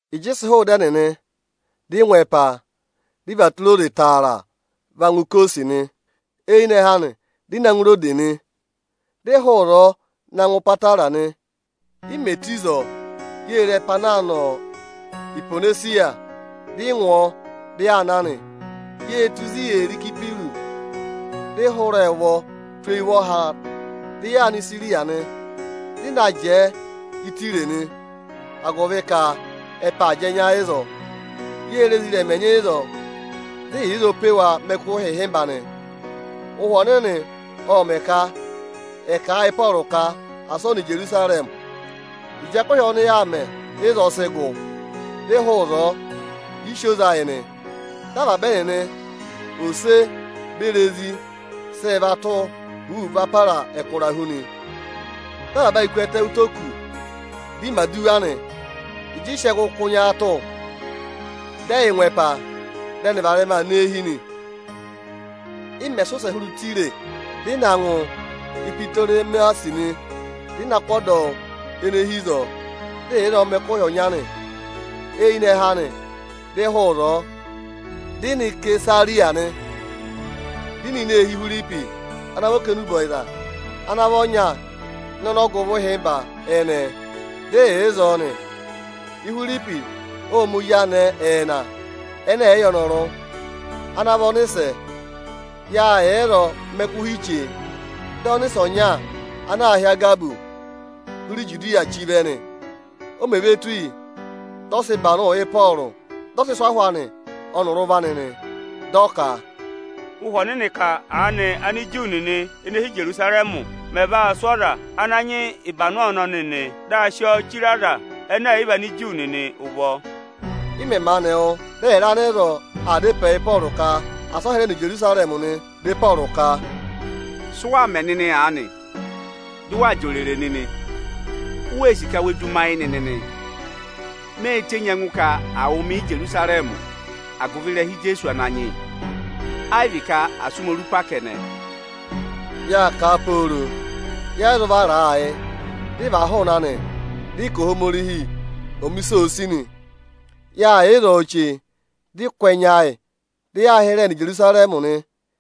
Ịjị ị sị hụụ ịda ẹnịnị, dị ị ngụ ẹpa, dị ị và tụra oze taara va ngụ Ikosi nị. Eyinẹhẹ anị, dị ị na ngụ Irodesi nị, dị ị hụụ ịzọọ na ngụ Ipatara nị. I mè tù ịzọọ, yê re ẹpa ana aa nọ Ihwonesiya, dị ị ngụ ọọ, dị yaa na nị. Yê tù ịzị yee re Ịsayịpịrụsị, dị ị hụrẹẹ ụvọ tụ́ eyi ụvọha, dị yaa nọ Isiriya nị. Dị ị na jẹẹ Ịtaya nị, agụvị ka ẹpa aa jị ẹnya ịzọọ. Yê re ezirẹma ẹnyị ịzọọ, dị ị yà ịzọọ pe wa mẹ ẹkụhị ịhịmba nị. Ụhwẹ Ọnịnị ộ mẹ̀ ka ẹ̀ kà a yị Ịpọọrụ ka asị ọ nọ Ijerusarẹmị. Ịjị ẹkụhị ọnị yaa mẹ ịzọọ sị gụ, dị ị hụụ ịzọọ, dị ị sị oze ayị nị. Dị avaba ẹnịnị, ose beri ezi sị yị va tụ́ huuu va para ẹkụra hu nị. Dị avaba ayị ku ẹtẹ ụtọ oku, dị ị mẹ̀ aduwa nị. Ịjị ị sị ẹngụ kụ́ nyaatụ, dị ẹyị ngụ ẹpa, dị ẹnị varẹma aa nọ eehi nị. Ị mẹ̀ sị ụsẹ hụrẹ Ịtaya, dị ị nọ ngụ Ipitoremasi nị. Dị ị na kụ́ ọdọwụ ene hi ịzọọ, dị ị yà ịzọọ mẹ ẹkụhị ọnya nị. Eyinẹhẹ anị, dị ị hụụ ịzọọ, dị ị na Isesariya nị. Dị ị nọ ini eehi Ihwiripi ana vị okenubọyịza ana vị ọnya ịnị ọnọgụvọ ịhịmba ẹnẹẹ, dị yà ịzọọ nị. Ihwiripi ộ ma ezi anẹẹ ẹẹna ẹnẹ ẹ̀ yị yẹ ọnọrụ, ana vị ọnịsẹ. Yâ yà ịzọọ mẹ ẹkụhị chee, dị ọnịsẹ ọnya ana aā hị́ Agabọsị hụrẹ Ijudiya chí vẹ nị. O mè ve tù yi, dị ọ sị ịbanụ Ịpọọrụ, dị ọ sị sụ́ ahụ anị ọnịrị ụvọ anị nị. Dị ọ ka, “Ụhwẹ Ọnịnị ka aanị Ániju nịnị ene hi Ijerusarẹmị mẹ̀ vaa sụ́ ọza ana nyị ịbanụ ọnọnị nị, dị a sị ọọ chire Anigiriki nịnị ụvọ.” Ị mẹ̀ maanị wụ́, dị ẹyịrị anịzọọ aa dá ịpẹẹ yị Ịpọọrụ ka asị ọ hịrẹ nọ Ijerusarẹmị nị. Dị Ịpọọrụ ka, “Sụ waa mẹ nịnị aanị, dị waa jị òrèrè nịnị? U wee sì ka we du mi ayị nịnị nịị? Mê tenyi ẹngụ ka à wụ̀ mị Íjerusarẹmị agụvị ịrẹha Ijeesu Ananyị yị, ayị vị ka à sụ́ mi orupa kẹnẹ.” Yâ kà pooro, yẹ yị zụ vara a ayị, dị ị và hụụnị anị nị. Dị ị ka Ohomorihi ọ̀ mẹ ịsị òo sì nị. Yâ yà ịzọọ chee, dị ị kụ́ ẹnya ayị, dị yaa hịrẹẹ nọ Ijerusarẹmị nị.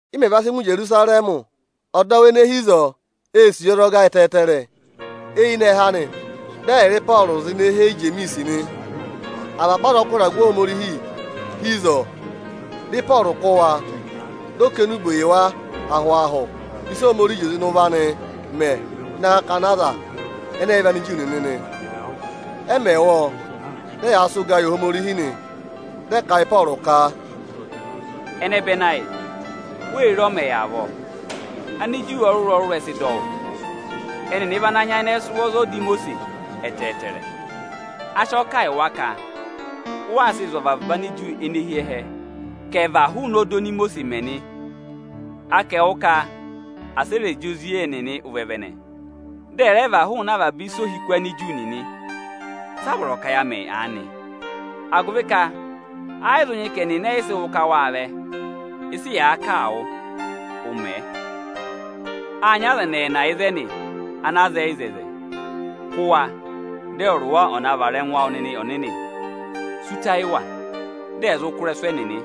Ị mẹ̀ va sị ngụ Ijerusarẹmị, ọdọwụ ene hi ịzọọ ê sì yi ọzọga ẹtẹẹtẹrẹ. Eyinẹhẹ anị, dị ẹyịrị Ịpọọrụ zị ne hee Ijemiisi nị. Avaba azọkụ ịragụ Ohomorihi hi ịzọọ. Dị Ịpọọrụ kụ́ wa, dị ọ kà enube yị wa ahụ-ahụ ịsị Ohomorihi zị oze ịnị ụvọ anị mẹ ịnị akakana Anigiriki nịnị nị. Ẹ mẹ̀ wụ́ ọọ, dị ẹyaa sị ụgaa yị Ohomorihi nị. Dị ẹ kà a yị Ịpọọrụ ka, “Ẹnẹbẹnị ayị, wê re, ọ mẹ̀ yà avọọ. Aniju ọrụrụ-ọrụrụ ẹ sị dọ wụ́. Ẹnịnị vị ana nyayịnẹ sị ụvọ za ọda Imosiisi ẹtẹẹtẹrẹ. A sị ọọ kà yị wa ka ụ waa sịị zụ̀ avaba Aniju ene hi ẹhẹ ka ẹ̀ và hụụnị ọda oni Imosiisi mẹ nị. A ka ẹwụ ka asị ẹ rẹ jị ozi ẹnịnị ụvẹvẹnẹ, dị ẹ̀ rẹ và hụụnị avaba ịsa ohiku Aniju nịnị. Sị a vọrọ ka ya mẹ aanị? Agụvị ka ayị zụ nyị ka ẹnịnị ẹyị sị wụ́ ka wâ vẹ. Ịsị yàa kà a wụ, ụ mẹẹ. Â nyị aza ẹnị ẹẹnị ịzẹnị ana zẹẹ ịzẹzẹ. Kụ́ wa, dị ẹwụrị wa ọ̀ na vara ẹngụ awụ nịnị ọnịnị! Sí ụta yị wa, dị ẹ̀ zụ kụ́ ịrẹsụ ẹnịnị!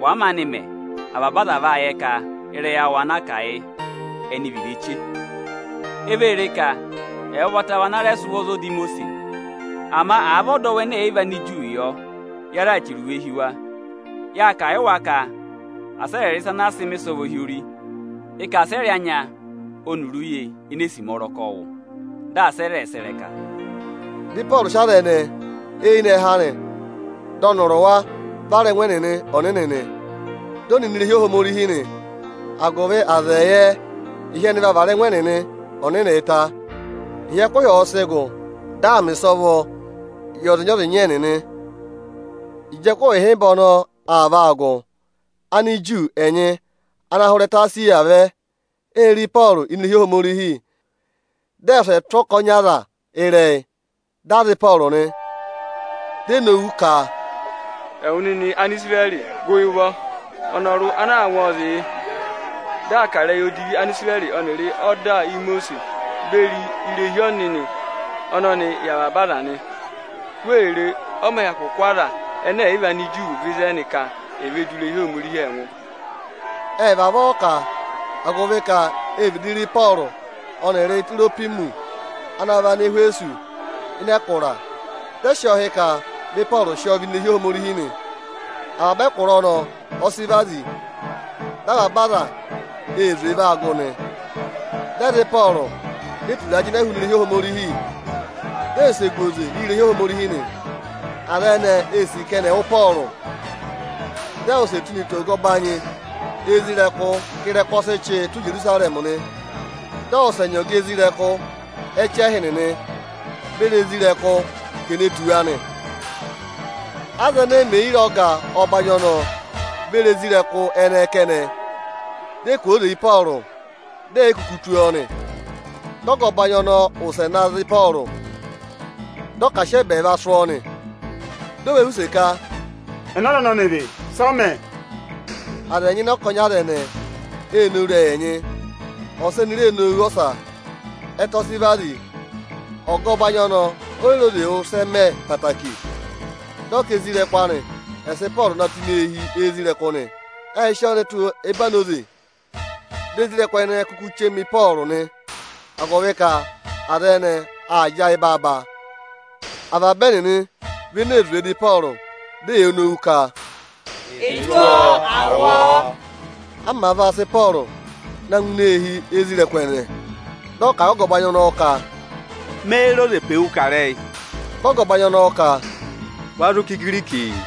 Wàa maanị mẹ, avaba aza vaa yẹ ka ịrẹyị awụ anaa kà yị ẹnị vị ireche. E vee ree ka ẹwụ ụvọta vị ana rẹ sị ụvọ za ọda Imosiisi. Ama àa vị ọdọwụ ẹnẹ ẹ̀ yị vị Aniju yọ, ya raà chẹrẹ iwe hi wa. Yâ kà a yị wa ka asị ẹ rị ịsa ana àa sị mẹ̀ ịsọvọ hi ori. Ị ka asị ẹ rị anya ọnịrị uye enee sima ọrọkọ wụ: dị asị ẹ rẹ sẹ̀ ịrẹka.” Dị Ịpọọrụ sị aza ẹnẹẹ, eyinẹhẹ anị dị ọnịrị wa vara ẹngụ ẹnịnị ọnịnị nị. Dị ẹ nọ ini irehi Ohomorihi nị, agụvị aza ẹ̀ yẹ ka ịhị ẹnị vaa vara ẹngụ ẹnịnị ọnịnịị ta. Ịhị ẹkụhị ọ̀ọ sị gụ, dị a mẹ̀ ịsọvọ yị ọzịnya-ọzịnya ẹnịnị. Ịjị ẹkụhị ịhịmba ọnọọ aa vaa gụ, Aniju ẹnyị ana hụrẹ ẹtẹ Esiya vẹ, ê re Ịpọọrụ ini irehi Ohomorihi. Dị ẹ wụsẹ tụ́ ọkọnị aza ịrẹyị, dị ẹ za Ịpọọrụ nị. Di e nowu ka, “Ẹwụ nịnị Anisirẹrị, gụ yị ụvọ! Ọnọrụ ana aa ngụ ọọ zị yị, dị aa kà ịrẹyị odivi Anisirẹrị ọnịrị ọda Imosiisi beri irehi ọnịnị ọnọnịị yị avaba aza nị. Wee re, ọ mẹ̀ hyakụ kụ́ Anigiriki vẹ ịzẹnị ka è ve du irehi Ohomorihi ẹngụ!” Ẹ́ vavọọ kà, agụvị ka ê vịdị re Ịpọọrụ ọnịrị Itirohwimọsị ana vị Anẹhwẹsọsị ịnị ẹkụra, dị ẹ sị ọọ hị́ ka vị Ịpọọrụ sị ọọ vẹ ini irehi Ohomorihi nị. Avaba ẹkụra ọnọọ ọ sị vazi, dị avaba aza ee zwee va gụ nị. Dị ẹ za Ịpọọrụ, di e turaa jịnẹ hụụnị irehi Ohomorihi, dị ẹ wụsẹ gu oze irehi Ohomorihi nị. Aza ẹnẹẹ ee sì ka ẹnị ẹ̀ wụ Ịpọọrụ. Dị a wụsẹ tụ́ ne tù ọga ọbanyị isoja nịnị ka ịrẹkụ ọ sị chị tụ́ Ijerusarẹmị nị. Dị ọ wụsẹ nyị ọga isoja nịnị ẹchẹhị nịnị beri isoja nịnị ka è ne tù wa nị. Aza ẹnẹẹ mè yi re ọga ọbanyị ọnọọ beri isoja nịnị ẹnẹẹ kẹnẹ, di e kwooze yị Ịpọọrụ, dị è yi kuku tụ́ ọọ nị. Dị ọga ọbanyị ọnọọ wụsẹ na za Ịpọọrụ, dị ọ ka à sị ẹba ẹẹva sụ́ ọọ nị Di o ve họ̀ use ka, “Ẹnẹ ọza ọnọnị vị? Sị ọ mẹ?” Aza ẹnyị ịnị ọkọnị aza ẹnẹẹ ee nowu ịrẹyị ẹnyị, ọsa eni ree nowu ọsa. Ẹtẹ ọ sị vazi, ọga ọbanyị ọnọọ oyi re oze wụ́ ịsị ẹ mẹ ẹtẹẹtẹrẹ. Dị ọ ka isoja nịnị anị ẹ̀ sị Ịpọọrụ na tụ́ ini eehi isoja nịnị nị. Ệ sị ọọ ne tù ẹbanoze, dị isoja nịnị ẹnẹẹ kuku chema Ịpọọrụ nị, agụvị ka aza ẹnẹẹ aa jị ayị baaba. Avaba ẹnịnị vị ene zwee dụ Ịpọọrụ, di eyee nowu ka, “È tụ́ ọọ, à wụ ọọ!” A màa vaa sị Ịpọọrụ naa ngụ ini eehi isoja nịnị ẹnẹẹ, dị ọ kà a yị ọga ọbanyị ọnọọ ka, “Méé re oze pe wu kà ịrẹyị?” Dị ọga ọbanyị ọnọọ ka, “Wa zụ kà Igirikii?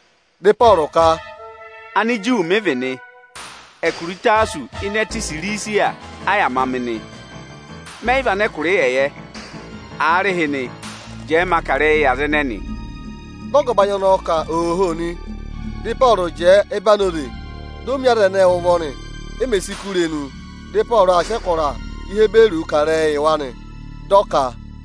Dị Ịpọọrụ ka, “Aniju mị vị nị. Ẹkụra Ịtasọsị ịnị ẹtẹ Isirisiya a yà ma mị nị. Mẹ yị vị anẹkụra ịyẹyẹ. Aarịhịnị, jẹẹ ma kà ịrẹyị yị aza ẹnẹnị.” Dị ọga ọbanyị ọnọọ ka ooho nị. Dị Ịpọọrụ jẹẹ ẹbanoze, di o mi aza ẹnẹẹ ụvọ nị. E mè si kú irenu, dị Ịpọọrụ aa sị ẹkụra Ihiburuu kà ịrẹyịị yị wa nị. Dị ọ ka: